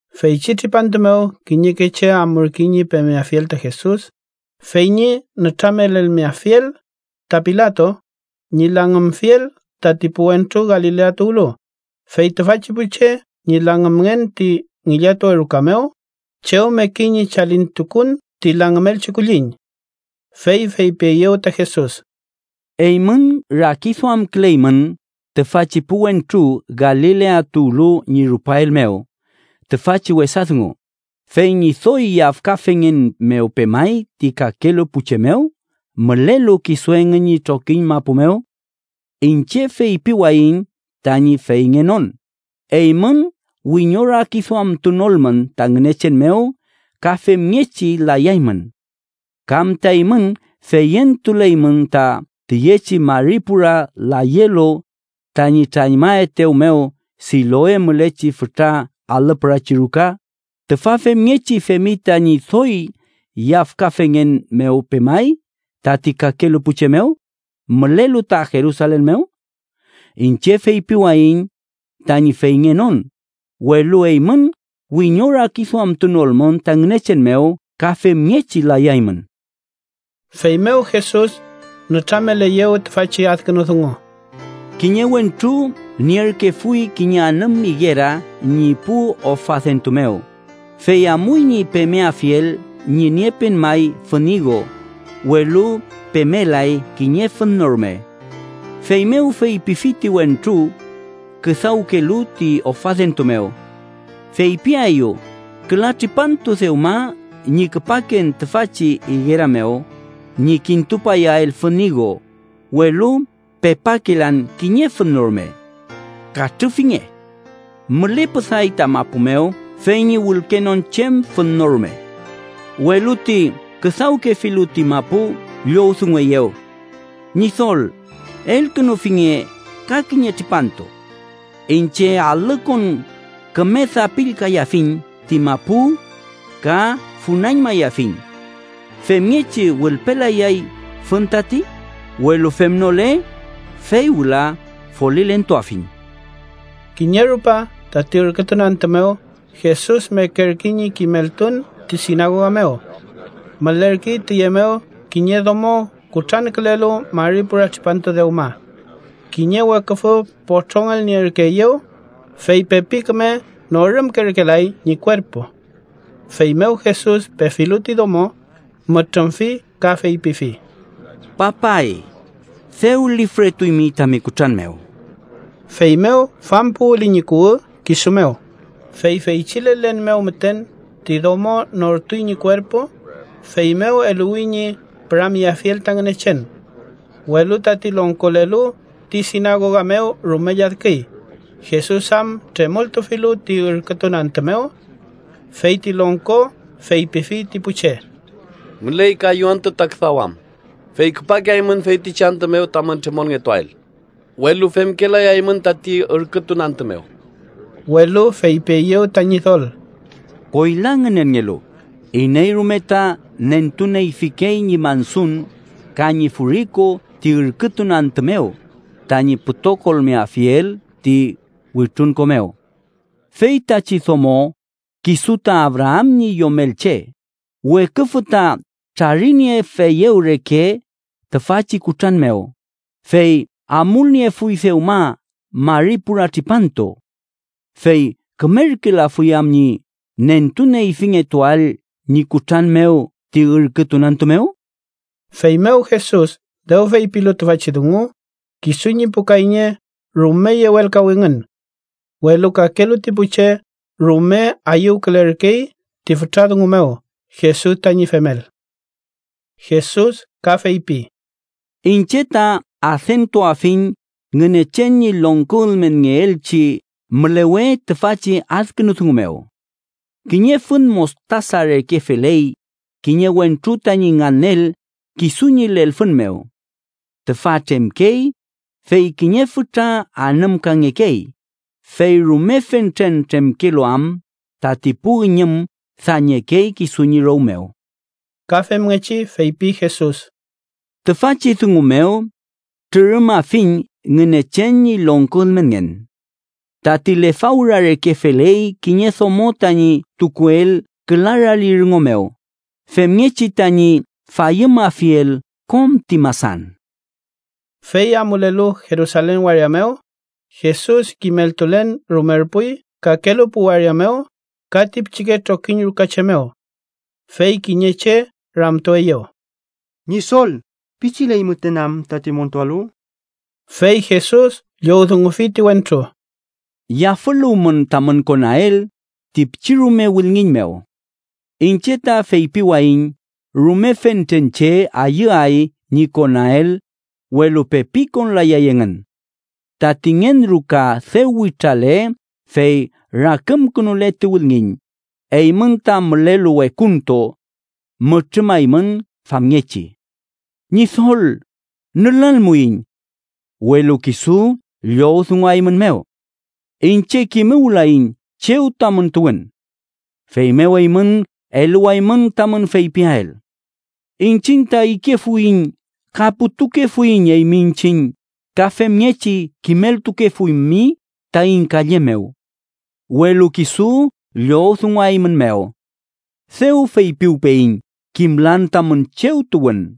Feychi tripantu mew kiñeke che amurkey ñi pemeafiel ta Jesus, fey ñi nütramelelmeafiel ta Pilato ñi langümfiel tati pu wentru Galilea tuwlu, fey tüfachi pu che ñi langümngen ti ngillatuwe ruka mew chew mekey ñi chalintukun ti langümelchi kulliñ. Fey feypieyew ta Jesus: “Eymün rakiduamküleymün tüfachi pu wentru Galilea tuwlu ñi rupael mew tüfachi wesa dungu, fey ñi doy yafkafengen mew pemay ti kakelu pu che mew mülelu kisu engün ñi trokiñ mapu mew. Iñche feypiwayiñ tañi feyngenon, eymün wiñorakiduamtunolmün ta Ngünechen mew ka femngechi layaymün. ¿Kam ta eymün feyentuleymün ta tüyechi mari pura layelu tañi trañmaetew mew Siloe mülechi fütra alü pürachi ruka, tüfa femngechi femi tañi doy yafkafengen mew pemay ti kakelu pu che mew mülelu ta Jerusalen mew? Iñche feypiwayiñ tañi feyngenon, welu eymün wiñorakiduamtunolmün ta Ngünechen mew ka femngechi layaymün.” Feymew Jesus nütrameleyew tüfachi adkünu dungu: “Kiñe wentru nierkefuy kiñe anüm igera ñi pu ofadentu mew, fey amuy ñi pemeafiel ñi niepen may fün igo, welu pemelay kiñe fün no rume. Feymew feypifi ti wentru küdawkelu ti ofadentu mew: ‘Feypiaeyu, küla tripantu dewma ñi küpaken tüfachi igera mew ñi kintupayael fün igo, welu pepakelan kiñe fün no rume. ¡Katrüfinge! Mülepüday ta mapu mew fey ñi wülkenon chem fün no rume.’ Welu ti küdawkefilu ti mapu llowdungueyew: ‘Ñidol, elkünufinge ka kiñe tripantu. Iñche alükon küme dapillkayafiñ ti mapu ka funañmayafiñ. Femngechi wülpelayay fün tati, welu femnole, fey wüla folilentuafiñ.’” Kiñe rupa, tati ürkütun antü mew, Jesus mekerkey ñi kimeltun ti sinagoga mew. Mülerkey tüye mew kiñe domo kutrankülelu mari pura tripantu dewma. Kiñe weküfü potrongelnierkeeyew, fey pepi küme norümkerkelay ñi kuerpu. Feymew Jesus pefilu ti domo, mütrümfi ka feypifi: —Papay, dew lifretuymi tami kutran mew. Feymew fampuwüli ñi kuwü kisu mew, fey feychi lelen mew müten ti domo nortuy ñi kuerpu, feymew eluwi ñi püramyeafiel ta Ngünechen. Welu tati longkolelu ti sinagoga mew rume lladküy, Jesus am tremoltufilu ti ürkütun antü mew. Fey ti longko feypifi ti pu che: —Müley kayu antü ta küdawam, fey küpakeaymün feytichi antü mew tamün tremolngetuael, welu femkelayaymün tati ürkütun antü mew. Welu feypieyew ta Ñidol: —Koyla ngünenngelu, iney rume ta nentuneyfikey ñi mansun ka ñi furiku ti ürkütun antü mew tañi pütokolmeafiel ti wütrunko mew. Feytachi domo, kisu ta Abraam ñi yomelche, weküfü ta trariniefeyew reke tüfachi kutran mew, fey amulniefuy dewma mari pura tripantu. ¿Fey kümerkelafuy am ñi nentuneyfingetuael ñi kutran mew ti ürkütun antü mew? Feymew Jesus dew feypilu tüfachi dungu, kisu ñi pu kayñe rume yewelkawingün. Welu kakelu ti pu che rume ayüwkülerkey ti fütra dungu mew Jesus tañi femel. Jesus ka feypi: “Iñche ta adentuafiñ Ngünechen ñi longko ülmenngeelchi mülewe tüfachi adkünu dungu mew: Kiñe fün mostasa reke feley, kiñe wentru tañi nganel kisu ñi lelfün mew. Tüfa tremkey, fey kiñe fütra anümkangekey, fey rume fentre tremkelu am tati pu üñüm dañekey kisu ñi row mew.” Ka femngechi feypi Jesus: “Tüfachi dungu mew trürümafiñ Ngünechen ñi longko ülmenngen: Tati lefawra reke feley kiñe domo tañi tukuel küla rali rüngo mew, femngechi tañi fayümafiel kom ti masan.” Fey amulelu Jerusalen waria mew, Jesus kimeltulen rumerpuy kakelu pu waria mew ka ti pichike trokiñ ruka che mew. Fey kiñe che ramtueyew: —Ñidol ¿pichiley müten am tati montualu? Fey Jesus llowdungufi ti wentru: —Yafüluwmün tamün konael ti pichirume wülngiñ mew. Iñche ta feypiwayiñ rume fentren che ayüay ñi konael, welu pepi konlayay engün. Tati ngen ruka dew witrale fey rakümkünule ti wülngiñ, eymün ta mülelu wekuntu mütrümaymün famngechi: ‘Ñidol, nülalmuiñ.’ Welu kisu llowdunguaeymünmew: ‘Iñche kimuwlayiñ chew tamün tuwün.’ Feymew eymün eluwaymün tamün feypiael: ‘Iñchiñ ta ikefuiñ ka putukefuiñ eymi iñchiñ ka femngechi kimeltukefuymi taiñ kalle mew.’ Welu kisu llowdunguaeymünmew: ‘Dew feypiwpeyiñ kimlan tamün chew tuwün.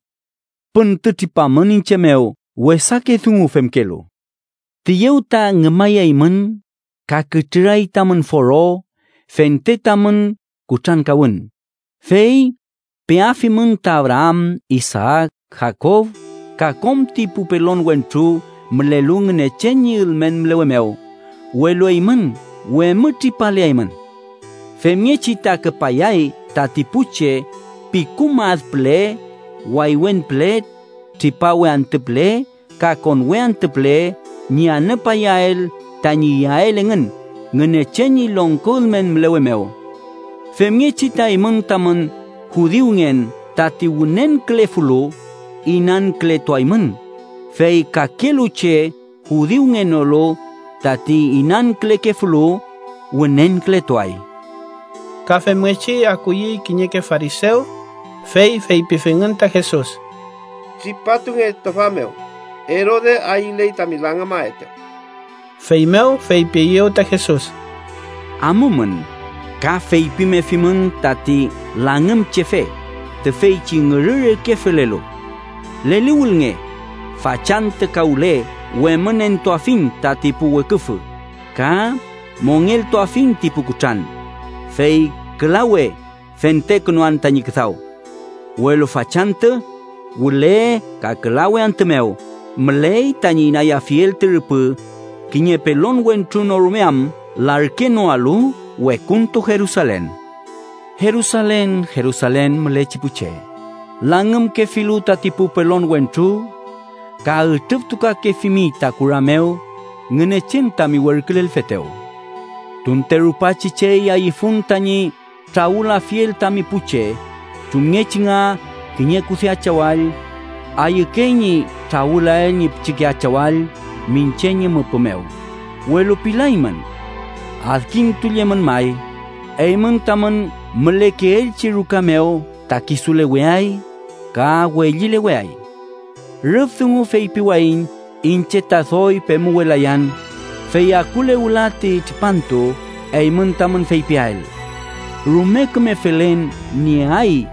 ¡Püntütripamün iñche mew wesake dungu femkelu!’ “Tüyew ta ngümayaymün ka kütrüray tamün foro fente tamün kutrankawün, fey peafimün ta Abraam, Isaak, Jakob ka kom ti pu pelon wentru mülelu Ngünechen ñi ülmen mülewe mew, welu eymün wemütripaleaymün. Femngechi ta küpayay tati pu che pikum ad püle, waywen püle, tripawe antü püle ka konwe antü püle ñi anüpayael tañi iyael engün Ngünechen ñi longko ülmen mülewe mew. Femngechi ta eymün tamün judiungen tati wünenkülefulu, inankületuaymün, fey kakelu che judiungenolu tati inankülekefulu, wünenkületuay.” Ka femngechi akuyey kiñeke farisew, fey feypifingün ta Jesus: —Tripatunge tüfa mew, Erode ayüley tami langümaetew. Feymew feypieyew ta Jesus: —Amumün ka feypimefimün tati langümchefe, tüfeychi ngürü reke felelu: ‘Leliwülnge, fachantü ka wüle wemünentuafiñ tati pu weküfü ka mongeltuafiñ ti pu kutran, fey külawe fentekünuan tañi küdaw.’ Welu fachantü, wüle ka külawe antü mew müley tañi inayafiel ti rüpü, kiñe pelon wentru no rume am larkenoalu wekuntu Jerusalen. “¡Jerusalen, Jerusalen mülechi pu che, langümkefilu tati pu pelon wentru ka ütrüftukakefimi ta kura mew Ngünechen tami werkülelfetew! ¡Tunte rupachi chey ayüfun tañi trawülafiel tami pu che, chumngechi nga kiñe kude achawall ayükey ñi trawülael ñi pichike achawall miñche ñi müpü mew, welu pilaymün! Adkintullemün may, eymün tamün mülekeelchi ruka mew ta kisuleweay ka wellileweay. Rüf dungu feypiwayiñ iñche ta doy pemuwelayan, fey akule wüla ti tripantu eymün tamün feypiael: ‘¡Rume küme felen nieay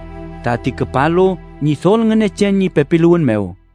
tati küpalu Ñidol Ngünechen ñi pepiluwün mew!’”